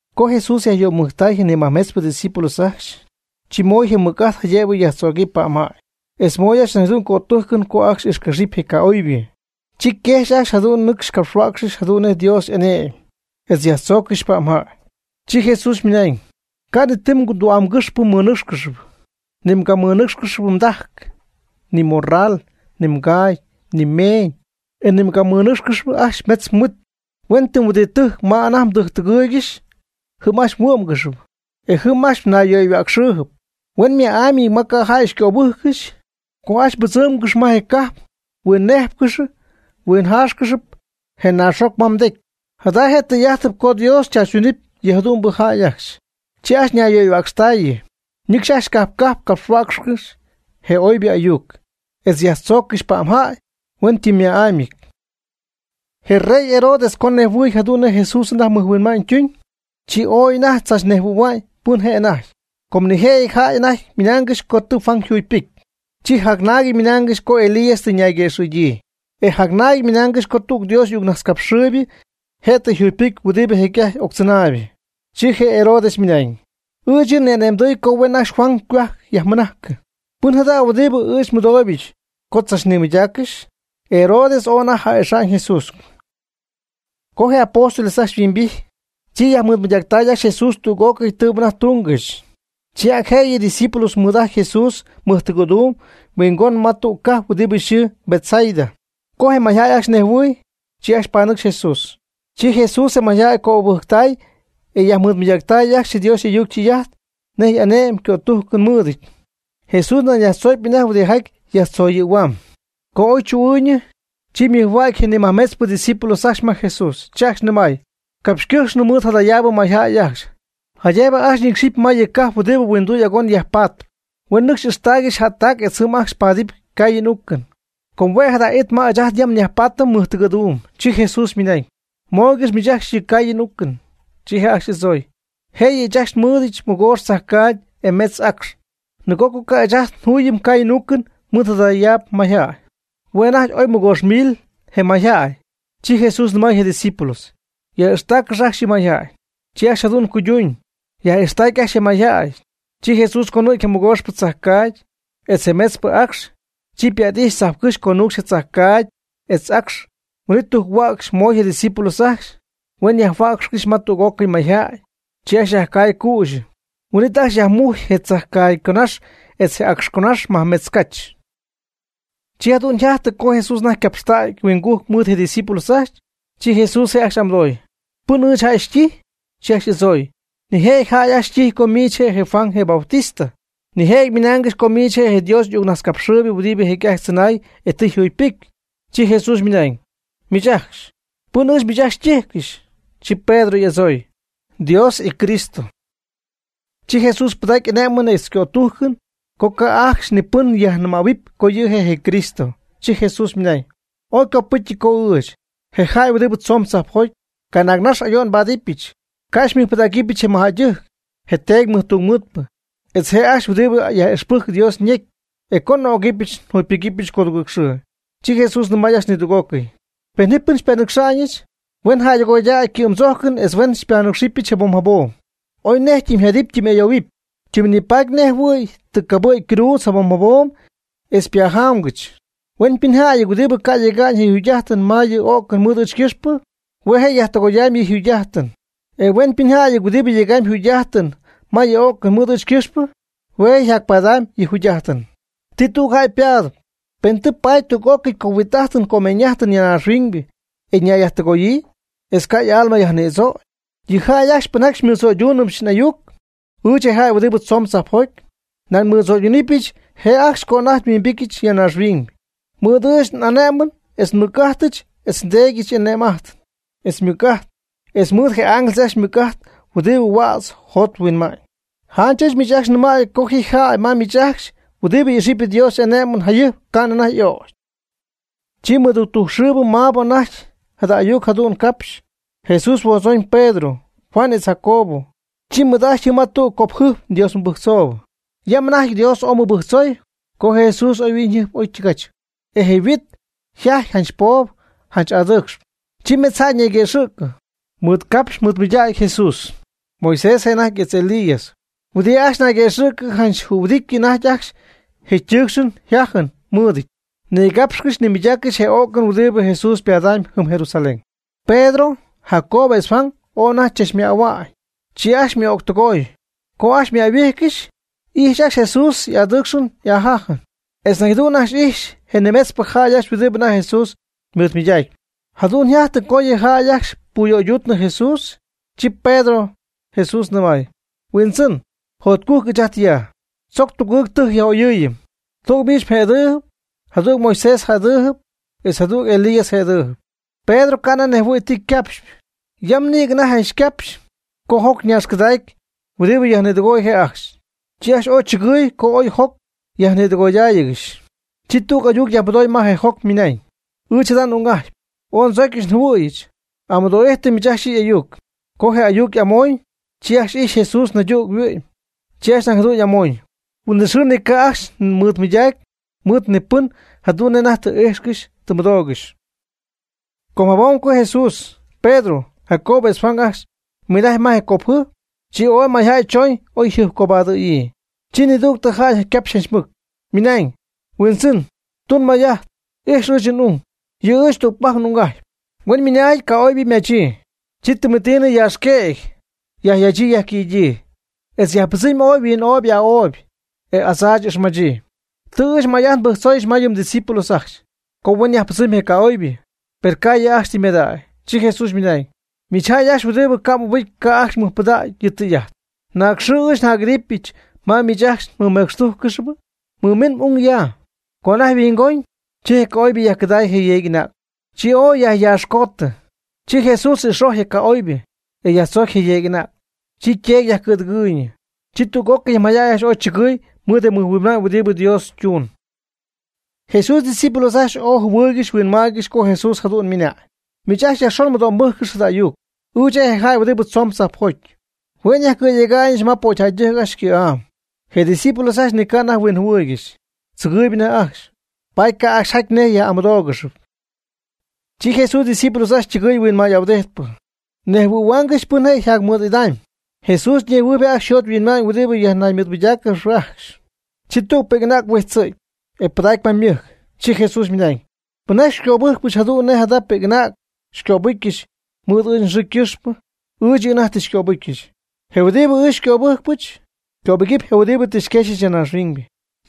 Co Jesús yajyöymujctay je ni majmetzpɨ ydiscípulos ajcxy, chi moy je mɨc'ajt jaydëbɨ yajtzögɨpy pa'mjäy, etz moy ajcxy nañ jadu'n cötújcɨn co ajcxy ixquexɨpy je ca'oybɨ. Chi quejxy je' ajcxy ñɨcxy capxhuäcxcɨxy jadu'n nej Dios y'ane'my, etz yajtzooccɨxy pa'mjäy. Chi Jesús ymɨnañ: ―Ca' ni ti tü'amgɨxpɨ mmɨnɨ́cxcɨxy; ni mgamɨnɨ́cxɨp mdajc, ni mmorral, ni mgaagy, ni meeñ, e ni mgamɨnɨ́cxcɨxɨpy ajcxy metz mhuit. Huen tɨm huɨdi tɨjc ma anajty mdɨgɨɨygɨxy, jɨm ajcxy huɨ́'mgɨxɨpy, e jɨm ajcxy nayyöyhuäcxɨɨyb. Hueñyma'amyɨty ma ca' jäy xycöbɨ́jccɨxy, co ajcxy mbɨdzɨ́mgɨxɨpy ma je' cajp mhuinnéjpcɨxɨpy mhuinjáaxcɨxɨpy je naaxjoc ma mdecy. Jada je' tɨy'ájtɨp co Dios tzaachytunɨpy yɨ jadu'mbɨ jäy ajcxy. Chi ajcxy ñayyöyhuäcxtaayɨ, ñɨcxy ajcxy cajp cajp capxhuäcxcɨxy je oybɨ ayuc, etz yajtzooccɨxy pa'mjäy hueñytɨmma'ámyɨty. Je rey Herodes co nejhuɨɨy jadu'n nej Jesús anajty mɨjhuinma'ñ tuñ, chi ooy anajty tzachnejhuɨ̈hua'ñ pɨn je' anajty. Com nijëjɨty jäy anajty ymɨnaangɨxy co tɨ Juan jugypɨcy. Chi jacnaagɨty ymɨnaangɨxy co Elías tɨ ñayguëxɨ̈gyii, e jacnaagɨty ymɨnaangɨxy co tüg Dios y'ayucnajtzcapxɨɨybɨ je' tɨ yjugypɨcy huɨdi jecy'ajty octzɨnaybɨ. Chi Herodes ymɨnañ: ―Ɨɨch yɨ' ni'ane'mdɨy co huen ajcxy Juan ycohuajc yajmɨnajcɨ. ¿Pɨn jada jada' huɨdi ɨɨch nmɨdooybɨch co tzachnimɨydaaccɨxy? Herodes ooy anajty ja'ixa'ñ Jesús. Co je apóstoles ajcxy yhuimbijty, chi yajmɨɨdmɨydactay ajcxy Jesús tüg'ócɨy tɨɨbɨ anajty túngɨxy. Chi ac jëyɨ ydiscípulos mɨɨd'ajty Jesús mɨjtɨgɨ̈duum huingon ma tüg cajp huɨdi yxɨɨ Betsaida. Co je mayjäy ajcxy nejhuɨɨy, chi ajcxy panɨcxy Jesús. Chi Jesús je mayjäy cöbɨjctay etz yajmɨɨdmɨydacy ajcxy Dios y'ayuc ytɨy'ajt nej ané'mɨn cötújcɨn mɨɨdɨty. Jesús nañ yajtzöcpy anajty huɨdijaty yajtzoyɨ̈huaam. Co oy chu'ɨɨyñɨ, chi ymɨjhuägy je nimajmetzpɨ ydiscípulos ajcxy ma Jesús, chi ajcxy nɨmay: ―Capxycɨjxnɨ mɨɨd jadayaabɨ mayjäy ajcxy, jaydëbɨ ajcxy ñɨcxɨpy ma yɨ cajp huɨdi huinduy agon yajpaatpɨ, huen nɨcxy ixtaaygɨxy jättac etz jɨm ajcxy paadɨpy caayɨn uucɨn. Com hue' jada it ma ɨɨch ajt yam nyajpaatɨm mɨjtɨgɨ̈duum. Chi Jesús ymɨnañ: ―Mooygɨx miich yɨ' ajcxy ycaayɨn y'uucɨn. Chi je' ajcxy y'adzooy: ―Jëyɨ ɨɨch ajcxy nmɨɨdɨdyɨch mɨgoox tzajcaagy e mejtz acx, nɨgo co ca' ɨɨch ajcxy njuy caayɨn uucɨn mɨɨd jadayaab mayjäy. Hue' anajty oy nimɨgoox mil je jäy. Chi Jesús nɨmay je discípulos: ―Yaj'ixtaaccɨx ajcxy yɨ mayjäy. Chi ajcxy jadu'n cuyduuñ, yaj'ixtactay ajcxy je mayjäy. Chi Jesús conɨ̈gy je mɨgooxpɨ tzajcaagy, etz je metzpɨ acx, chi ypa't'ijxy tzajpcɨ́xy conuucxy je tzajcaagy etz acx, huin'it tujc-huäcxy moy je' ydiscípulos ajcxy, huen yajhuäcxcɨxy ma tüg'ócɨy mayjäy. Chi ajcxy ycay cüxyɨ, huin'it ajcxy yajmujcy je tzajcaagy yconaxy etz je acx yconaxy majmetz cach. Chi jadu'n yjajtɨ co Jesús anajty ycapxtägy ahuingujc mɨɨd je' ydiscípulos ajcxy, chi Jesús je' ajcxy y'amɨdoy: ―¿Pɨn ɨɨch jäy xytijy? Chi ajcxy y'adzooy: ―Nijëjɨty jäy xytijy co miich je Juan je Bautista; nijëjɨty ymɨnaangɨxy co miich je' Dios y'ayucnajtzcapxɨɨybɨ huɨdi jecy'ajty tzɨnay e tɨ yjugypɨcy. Chi Jesús ymɨnañ: ―¿Miich ajcxy, pɨn ɨɨch miich ajcxy xytíjcɨxy? Chi Pedro y'adzooy: ―Dios yCristo. Chi Jesús pɨdacy ané'mɨn etz cötújcɨn co ca' ajcxy ni pɨn yajnɨmähuɨp co yɨ' je' Cristo. Chi Jesús ymɨnañ: ―Ooy ycopɨ́cyɨty co ɨɨch, je jäy huɨdi tzoon tzajpjoty, canaag nax ayo'n nbáadɨbɨch, ca' xymɨjpɨdägɨbɨch je mɨjjäydɨjc, je teedy tungmɨɨdpɨ, etz je' ajcxy huɨdi yaj'ixpɨcy Dios ñecy, e co n'ögɨp njugypɨgɨ́pyɨch codugɨɨg xɨɨ. Chi Jesús nɨmay ajcxy nidüg'ócɨy: ―Pen ji pɨn xypanɨcxa'ñɨch, huen jäydɨgoydäy ycɨ'm tzójcɨn etz huen xypanɨcxyɨch jabom jabom, oy nej ytɨmyjadɨpy ytɨmy'ayoohuɨpy, tɨm nipaady nej jɨhuɨ̈y tɨ cabɨ̈gy mgruudz jabom jabom etz pajamgɨch. Huen pɨnjäy huɨdibɨ ca' yega'ñ yɨ yjugy'ájtɨn ma yɨ o'cɨn mɨɨd ɨɨch ycɨxpɨ, hue' je' yajtɨgoyamy yɨ' yjugy'ájtɨn. E huen pɨnjäy huɨdibɨ yegamy yjugy'ájtɨn ma yɨ o'cɨn mɨɨd ɨɨch ycɨxpɨ hue' je' ypadamy yɨ jugy'ájtɨn. ¿Ti tüg jäy ypatpy, pen tɨ paady tüg'ócɨy cohuit'ájtɨn comeeñ'ájtɨn ya naaxhuiñ e nayyajtɨgoyii, etz ca' y'alma yajnïdzögy? Yɨ jäy ajcxy pɨnjaty xymɨdzöydúnɨbɨch n'ayuc, ɨɨch je' je jäy huɨdi tzoon tzajpjoty, nañ nmɨdzöydunɨɨybɨch je' ajcxy co anajty nhuimbityɨch ya naaxhuiñ, mɨɨd ɨɨch n'ané'mɨn etz nmɨc'ajtɨch etz nDéedyɨch y'ane'm'ajt, etz ymɨc'ajt, etz mɨɨd je ángeles ajcxy ymɨc'ajt huɨdibɨ huädz yjot yhuinma'ñ. Janch ɨɨch miich ajcxy nɨmäy co ji jäy ma miich ajcxy huɨdibɨ ixɨpy Dios y'ané'mɨn jayɨjp ca'nɨ anajty y'ögy. Chi mɨductujc xɨɨbɨ maabɨ anajty jada ayuc jadu'n capxy, Jesús huodzooñ Pedro, Juan etz Jacobo, chi mɨɨd'ajtpy jɨm ma tüg copjɨjp Dios mɨbɨjctzoob. Yam anajty Dios ooy mɨbɨjctzoy, co Jesús yhuiñyjɨjp oytɨgach, e je yhuit yjajty janch poob janch adɨɨcxp. Chi metz jäy ñayguëxɨ̈cɨ, mɨɨdgapxy mɨɨdmɨydägy Jesús, Moisés je' anajty etz Elías. Huɨdi ajcxy naygëxɨ̈cɨ janch jühuɨdityɨ anajty ajcxy je tɨɨcxɨn jájɨn mɨɨdɨty, nigapxcɨxy nimɨydaaccɨxy je o'cɨn huɨdi Jesús ypadamy jɨm Jerusalén. Pedro, Jacobo etz Juan ooy anajty ajcxy chachmähuanɨ, chi ajcxy mɨ'ögtɨgooy. Co oy ymäyhuijcɨxy, ijxy ajcxy Jesús y'adɨɨcxɨn y'ajajɨn, etz nañ jadu'n ijxy ajcxy je nimetzpɨ jäy ajcxy huɨdi anajty Jesús mɨɨdmɨydäcpy. Jadu'n yjajty co yɨ jäy ajcxy puyöyduutnɨ Jesús. Chi Pedro Jesús nɨmay: ―Huindzɨn, jotcujc ɨɨch ajt ya. Tzoc tugɨɨg tɨjc yaj'oyɨ́ɨyɨm, tüg miich mjëdɨɨby, jadüg Moisés jëdɨɨby, etz jadüg yɨ Elías jëdɨɨby. Pedro ca' anajty nejhuɨɨy ti ycapxpy. Yam nïgɨ anajty ycapxy co joc ñaaxcɨdacy huɨdi yajnïdɨgoy je' ajcxy. Chi ajcxy ooy chɨgɨɨy co oy joc yajnïdɨgoydáayɨgɨxy. Chi tüg ayuc yajmɨdooy ma je joc ymɨnañ: ―Ɨɨch jada n'ung'ajtpy, ooy ndzocyɨch njɨhuɨ̈yɨch. Amɨdo'ijtɨ miich ajcxy yɨ' y'ayuc. Co je ayuc y'amoñ, chi ajcxy ijxy Jesús naydüg yhuɨ'my, chi ajcxy nañ jadu'n amoñ. Huin'it xɨɨ ni ca' ajcxy mɨydacy mɨɨd ni pɨn jadu'n nej anajty tɨ y'ijxcɨxy tɨ ymɨdoogɨxy. Com jabom co Jesús, Pedro, Jacobo etz Juan ajcxy ymɨnajcy ma je copjɨjp, chi ooy mayjäy chooñ oyjɨjpcobadɨ̈yii. Chi nidügtɨ jäy ycapxy janch mɨc, ymɨnañ: ―Huindzɨn tun may'ajt ix ɨɨch n'ung, yɨ' ɨɨch tügpajc n'ung'ajtpy. Huen mɨnáajɨty ca'oybɨ ymachyii, chi tɨmetiinɨ yaaxquëgy yajyachyii yajquïdyii, etz yajpɨdzɨmy oy yhuin'opy y'aa'opy e adzaach y'ixmachyii. Tɨ ɨɨch may'ajt nbɨjctzooyɨch ma yɨ mdiscípulos ajcxy, co huen yajpɨdzɨmy je ca'oybɨ, per ca' yɨ' ajcxy tɨ mɨmadägy. Chi Jesús ymɨnañ: ―¡Miich jäy ajcxy huɨdibɨ ca' mɨbɨjcp ca' ajcxy mmɨjpɨdäga'ñ yɨ tɨy'ajt! ¿Naag xɨɨ ɨɨch njac'idɨpy ma miich ajcxy nmɨmecxtújccɨxɨpy? Mɨmin m'ung ya. Co anajty yhuingoñ, chi je ca'oybɨ yajcɨdaay je yeeg'anäg, chi ooy yajyatzcootɨ. Chi Jesús ix'ojy je ca'oybɨ, e yajtzoocy je yeeg'anäg, chi yteedy yajcɨ̈dɨgɨɨyñɨ. Chi tüg'ócɨy je mayjäy ajcxy ooy chɨgɨɨy mɨɨd je mɨjhuinma'ñ huɨdi Dios ytuun. Jesús ydiscípulos ajcxy ooy jɨhuɨɨygɨxy huinmaaygɨxy co Jesús jadu'n ymɨnañ: ―Miich ajcxy yajxon mɨdo'mbɨ́jccɨx jada ayuc. Ɨɨch je' je jäy huɨdi tzoon tzajpjoty, hue' nyajcɨ̈yega'ñɨch ma pocyjäydɨjc ajcxy ycɨ̈'am. Je' ydiscípulos ajcxy ni ca' anajty huinjɨhuɨɨygɨxy, tzɨgɨɨyb anajty ajcxy, paady ca' ajcxy jaty nej yaj'amɨdóogɨxɨpy. Chi Jesús ydiscípulos ajcxy ytɨgɨɨy huinmay'ahuɨdijtp, nejhuɨ̈huaangɨxy pɨn je' jacmɨj'idam. Jesús nejhuɨɨy je' ajcxy yjot yhuinma'ñ huɨdi nayyajmɨɨdmɨydáacɨp ajcxy, chi tüg pi'c'anäg huijtzɨ̈gy, ypɨdacy ma ymɨjc. Chi Jesús ymɨnañ: ―Pɨnjaty xycöbɨjcpɨch jadu'n nej jada pi'c'anäg xycöbɨcyɨch mɨɨd ɨɨch nxɨɨ ycɨxpɨ, ɨɨch yɨ' anajty tɨ xycöbɨcyɨch; je huɨdibɨ ɨɨch xycöbɨ́jcpɨch, cöbɨgɨɨb je huɨdi tɨ xyquexyɨch ya naaxhuiñ.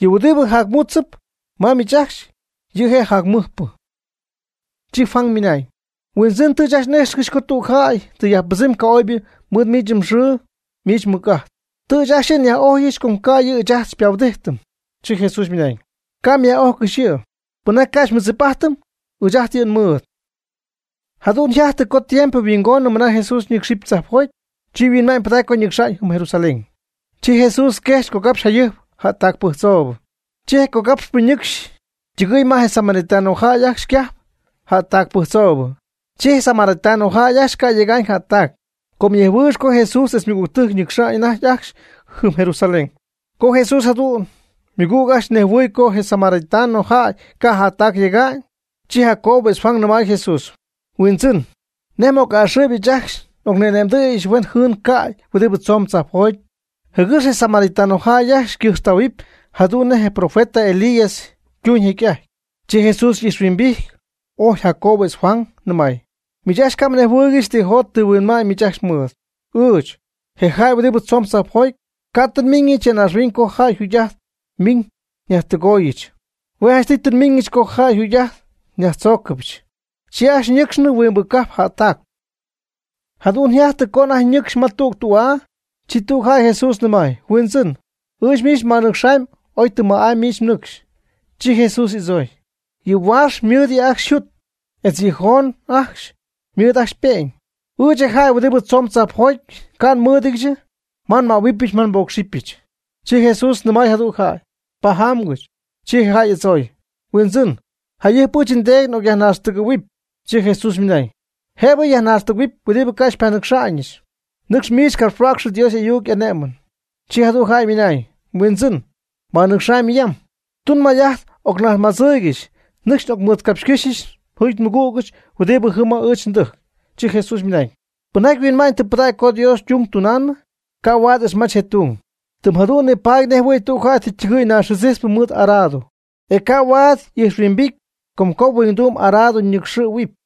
Yɨ' huɨdibɨ jacmútzɨp ma miich ajcxy, yɨ' je' jacmɨjpɨ. Chi Juan ymɨnañ: ―Huindzɨn, tɨ ɨɨch ajcxy n'íjxcɨxy co tüg jäy tɨ yajpɨdzɨmy ca'oybɨ mɨɨd miich mxɨɨ miich mmɨc'ajt. Tɨ ɨɨch ajcxy yɨ' nyaj'ojyɨch com ca' yɨ' ɨɨch ajt xypahuɨdijtɨm. Chi Jesús ymɨnañ: ―Ca' myaj'ójcɨxy yɨ'; pɨnjaty ca' xymɨdzip'ajtɨm, ɨɨch ajt yɨ' nmɨɨd. Jadu'n yjajtɨ co tiempo yhuingonɨ mɨna Jesús ñɨ́cxɨp tzajpjoty, chi yhuinma'ñ pɨdacy co nɨcxa'ñ jɨm Jerusalén. Chi Jesús quejxy cogapxy jayɨjp jättac pɨjctzoobɨ. Chi je cogapxy'ajtpɨ ñɨcxy ytɨgɨy ma je samaritano jäy ajcxy ycajp, jättac pɨjctzoobɨ. Chi je' samaritano jäy ajcxy ca' yega'ñ jättac, com ñejhuɨɨygɨxyp co Jesús etz ymɨgügtɨjc ñɨcxy anajty ajcxy jɨm Jerusalén. Co jadu'n Jesús ymɨgüg ajcxy nejhuɨɨy co je samaritano jäy ca' jättac yega'ñ, chi Jacobo etz Juan nɨmay Jesús: ―Huindzɨn, ¿nej m'a'ɨxɨɨyb ɨɨch ajcxy n'ocni'ane'mdɨ̈yɨch huen jɨɨn cäy huɨdibɨ tzomb tzajpjoty, jɨgɨx yɨ samaritano jäy ajcxy ycɨjxtähuɨpy jadu'n nej je profeta Elías ytuuñ jecy'ajty? Chi Jesús y'ijxhuimbijty, ojy Jacobo etz Juan, nɨmay: ―Miich ajcxy ca' mnejhuɨɨygɨxy tɨ jot tɨ huinma'ñ miich ajcxy mɨɨd. Ɨɨch, je jäy huɨdi tzoon tzajpjoty, ca' tɨ nmíñɨch ya naaxhuiñ co jäy yjugy'ajt miñ nyajtɨgooyɨch, hue' jánchtɨy tɨ nmiñɨch co jäy yjugy'ajt nyajtzóogɨbɨch. Chi ajcxy ñɨcxnɨ huingbɨ cajp jättacp. Jadu'n yjajtɨ co anajty ñɨ́cxcɨxy ma tüg tü'aa, chi tüg jäy Jesús nɨmay: ―Huindzɨn, ɨɨch miich nbanɨcxaamy oy tɨm ma'amy miich mnɨcxy. Chi Jesús y'adzooy: ―Yɨ huaax ymɨɨd yɨ' ajcxy yjut, etz yɨ joon ajcxy ymɨɨd ajcxy ype'ñ, ɨɨch je jäy huɨdi tzoon tzajpjoty ca' nmɨ́ɨdɨdyɨch ma nmähuɨbɨch ma nbócxɨbɨch. Chi Jesús nɨmay jadüg jäy: ―Pajamgɨch. Chi je jäy y'adzooy: ―Huindzɨn, jayɨjp ɨɨch ndeedy n'ocyajnaaxtɨgɨ̈huɨpy. Chi Jesús ymɨnañ: ―Jëbɨ yajnaaxtɨgɨ̈huɨpy huɨdibɨ ca' xypanɨcxa'ñɨch. Nɨcx miich capxhuäcxɨ Dios y'ayuc y'ané'mɨn. Chi jadüg jäy ymɨnañ: ―Huindzɨn, nbanɨcxamy yam. Tun may'ajt ocnajtzmadzɨɨygɨch nɨcxy n'ocmɨɨdcapxycɨ́xyɨch njuugy nmɨgügɨch huɨdi jɨm ma ɨɨch ndɨjc. Chi Jesús ymɨnañ: ―Pɨnjaty yhuinma'ñ tɨ pɨdägy co Dios ytung tunaanɨ, ca' huaad ixmach je tung, tɨm jadu'n nipaady nejɨhuɨɨy tüg jäy tɨ ytɨgɨ̈y naaxjɨdzijtzpɨ mɨɨd arado, e ca' huaad y'ijxhuimbity com co huinduum arado nɨcxɨ̈huɨpy.